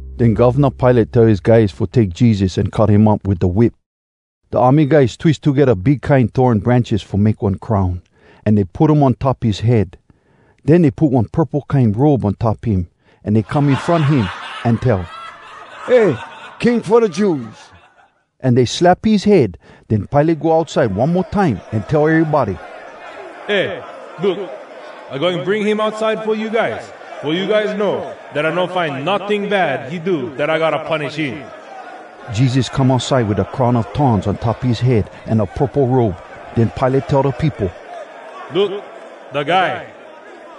Den Govna Pilate tell his guys fo take Jesus an cut him up wit da whip. Da army guys twis togedda big kine thorn branches fo make one crown, an dey put um on top his head. Den dey put one purple kine robe on top him. An dey come in front him, an tell, “Eh! King fo da Jews!” An dey slap his head. Den Pilate go outside one mo time, an tell erybody, “Eh, look! I goin bring him outside fo you guys, fo you guys know dat I no find notting bad he do dat I gotta punish him.” Jesus come outside wit da crown a thorns on top his head an da purple robe. Den Pilate tell da peopo, “Look, da guy!”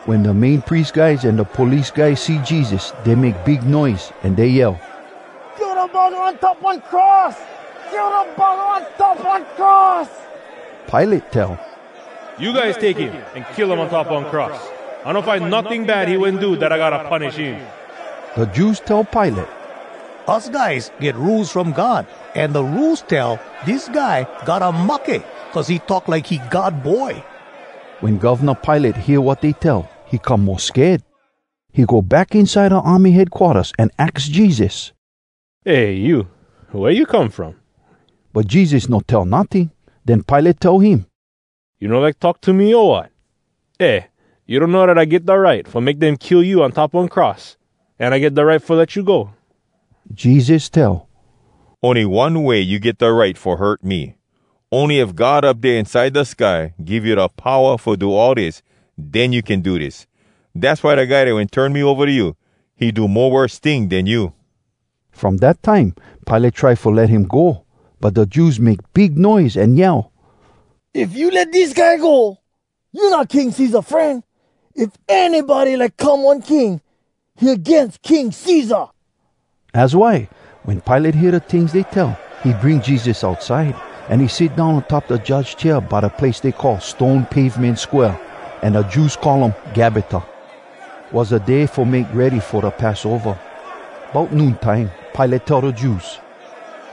Wen da Main Pries guys an da police guys see Jesus, dey make big noise, an dey yell, “Kill da buggah on top one cross! Kill da buggah on top one cross!” Pilate tell, “You guys take him an kill um on top one cross! I no find notting bad he wen do dat I gotta punish him.” Da Jews tell Pilate, “Us guys get Rules from God, an da Rules tell dis guy gotta mahke, cuz he talk like he God Boy.” Wen Govna Pilate hear wat dey tell, he come mo sked. He go back inside da army headquarters an aks Jesus, “Eh, you! Wea you come from?” But Jesus no tell notting. Den Pilate tell him, “You no like talk to me, o wat? Eh, you donno dat I get da right fo make dem kill you on top one cross, an I get da right fo let you go?” Jesus tell, “Ony one way you get da right fo hurt me. Ony if God Up Dea Inside Da Sky give you da powa fo do all dis, den you can do dis. Dass why da guy dat wen turn me ova to you, he do mo worse ting den you.” From dat time, Pilate try fo let him go. But da Jews make big noise an yell, “If you let dis guy go, you not King Cesar fren. If anybody like come one king, he agains King Cesar.” Az why, wen Pilate hear da tings dey tell, he bring Jesus outside, an he sit down on top da judge chair by da place dey call “Stone Pavemen Square,” an da Jews call um “Gabbata.” Was da Day fo Make Ready fo da Passova. Bout noon time, Pilate tell da Jews,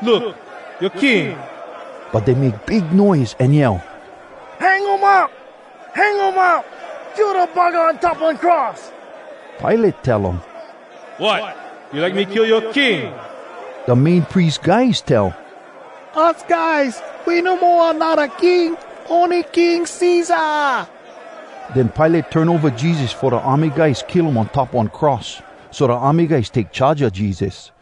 “Look, yoa king!” But dey make big noise an yell, “Hang um up! Hang um up! Kill da buggah on top one cross!” Pilate tell um, “Wot! You like me kill yoa king?!” Da Main Pries guys tell, “Us guys, we no mo anodda king, ony King Cesar!” Den Pilate turn ova Jesus fo da army guys kill um on top one cross. So da army guys take charge a Jesus.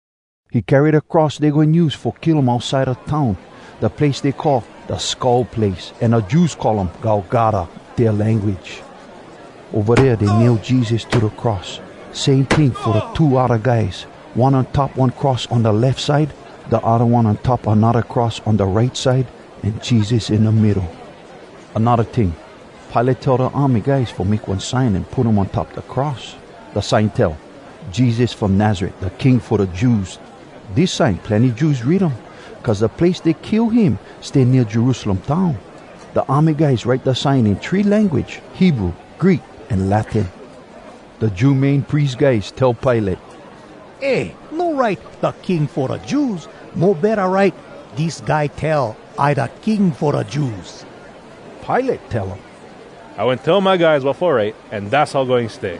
He carry da cross dey goin use fo kill um outside da town, da place dey call “Da Skull Place,” an da Jews call um “Golgota,” dea language. Ova dea dey nail Jesus to da cross. Same ting fo two odda guys, one on top one cross on da lef side, da odda one on top anodda cross on da right side, an Jesus in da middo. Anodda ting: Pilate tell da army guys fo make one sign an put um on top da cross. Da sign tell, Jesus From Nazaret Da King Fo Da Jews Dis sign, plenny Jews read um, cuz da place dey kill him stay nea Jerusalem town. Da army guys write da sign in three language: Hebrew, Greek, an Latin. Da Jew Main Pries guys tell Pilate, “Eh, no write, ‘Da King fo da Jews’! Mo betta write, ‘Dis guy tell, I da king fo da Jews’.” Pilate tell um, “I wen tell my guys wat fo write, an dass how goin stay!”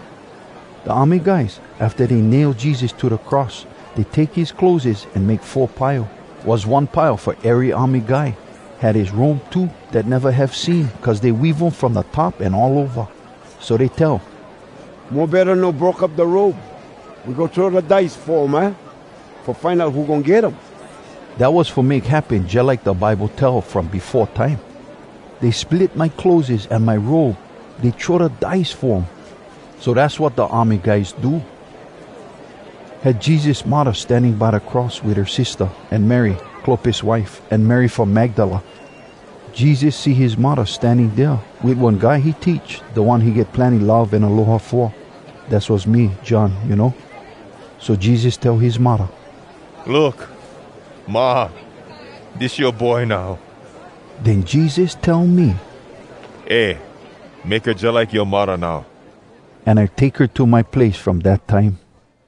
Da army guys, afta dey nail Jesus to da cross, dey take his clotheses an make four pile. Was one pile fo ery army guy. Had his robe too, dat neva have seam, cuz dey weave um from da top an all ova. So dey tell, “Mo betta no broke up da robe. We go throw da dice fo um, aah? Fo find out who goin get um.” Dat was fo make happen jalike da Bible tell from befo time: “Dey split my clotheses. An my robe, dey throw da dice fo um.” So dass wat da army guys do. Had Jesus muddah standing by da cross wit her sistah, an Mary, Clopas wife, an Mary from Magdala. Jesus see his muddah standing dea, wit one guy he teach, da one he get plenny love an aloha fo. (Dass was me, John, you know.) So Jesus tell his muddah, “Look, Ma, dis yoa boy now.” Den Jesus tell me, “Eh! Make her jalike yoa muddah now.” An I take her to my place from dat time.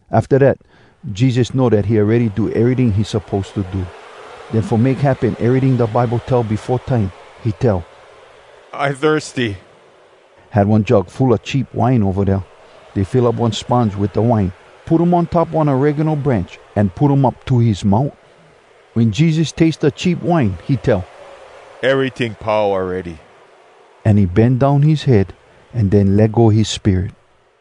Afta dat, Jesus know dat he awready do eryting he suppose to do. Den fo make happen eryting da Bible tell befo time, he tell, “I thirsty!” Had one jug full a cheap wine ova dea. Dey fill up one sponge wit da wine, put um on top one oregano branch, an put um up to his mout. Wen Jesus taste da cheap wine he tell, “Eryting pau awready!” An he bend down his head, an den let go his spirit.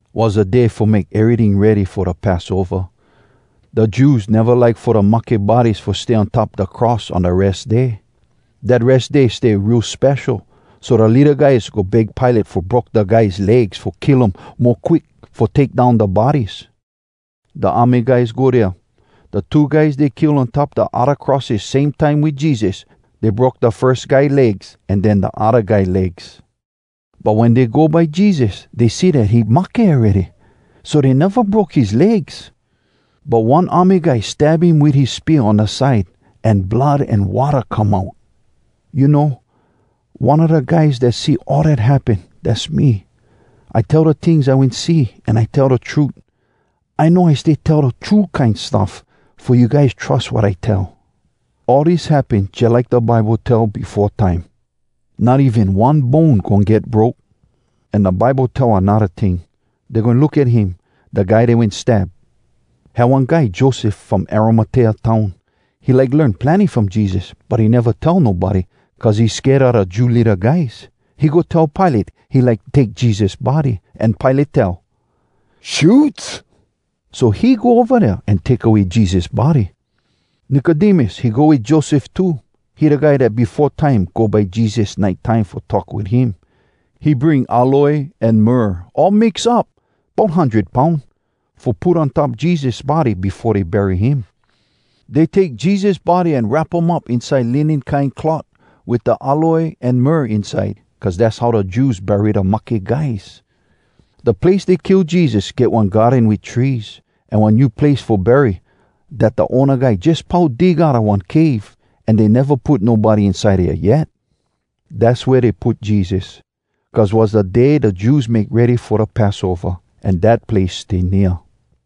Was da Day Fo Make Eryting Ready Fo Da Passova. Da Jews neva like fo da mahke bodies fo stay on top da cross on da Res Day. Dat Res Day stay real spesho, so da leada guys go beg Pilate fo broke da guys legs fo kill um mo quick fo take down da bodies. Da army guys go dea. Da two guys dey kill on top da odda crosses same time wit Jesus, dey broke da firs guy legs, an den da odda guy legs. But wen dey go by Jesus, dey see dat he mahke awready, so dey neva broke his legs. But one army guy stab him wit his spear on da side, an blood an watta come out. (You know, one a da guys dat see all dat happen, dass me. I tell da tings I wen see, an I tell da trut. I know I stay tell da true kine stuff, fo you guys trus wat I tell.) All dis happen jalike da Bible tell befo time, “Not even one bone goin get broke.” An da Bible tell anodda ting, “Dey goin look at him, da guy dey wen stab.” Had one guy Joseph from Arimatea town. He like learn plenny from Jesus, but he neva tell nobody, cuz he sked a da Jew leada guys. He go tell Pilate he like take Jesus body, an Pilate tell “Shoots.” So he go ova dea an take away Jesus body. Nicodemus, he go wit Joseph too. He da guy dat befo time go by Jesus nite time fo talk wit him. He bring aloe an myrrh, all mix up, bout hundred poun, fo put on top Jesus body befo dey bury him. Dey take Jesus body an wrap um up inside linen kine cloth wit da aloe an myrrh inside, cuz dass how da Jews bury da mahke guys. Da place dey kill Jesus, get one garden wit trees, an one new place fo bury dat da owna guy jus pau dig outa one cave, an dey neva put nobody inside dea yet. Dass wea dey put Jesus, cuz was da Day da Jews Make Ready fo da Passova, an dat place stay nea.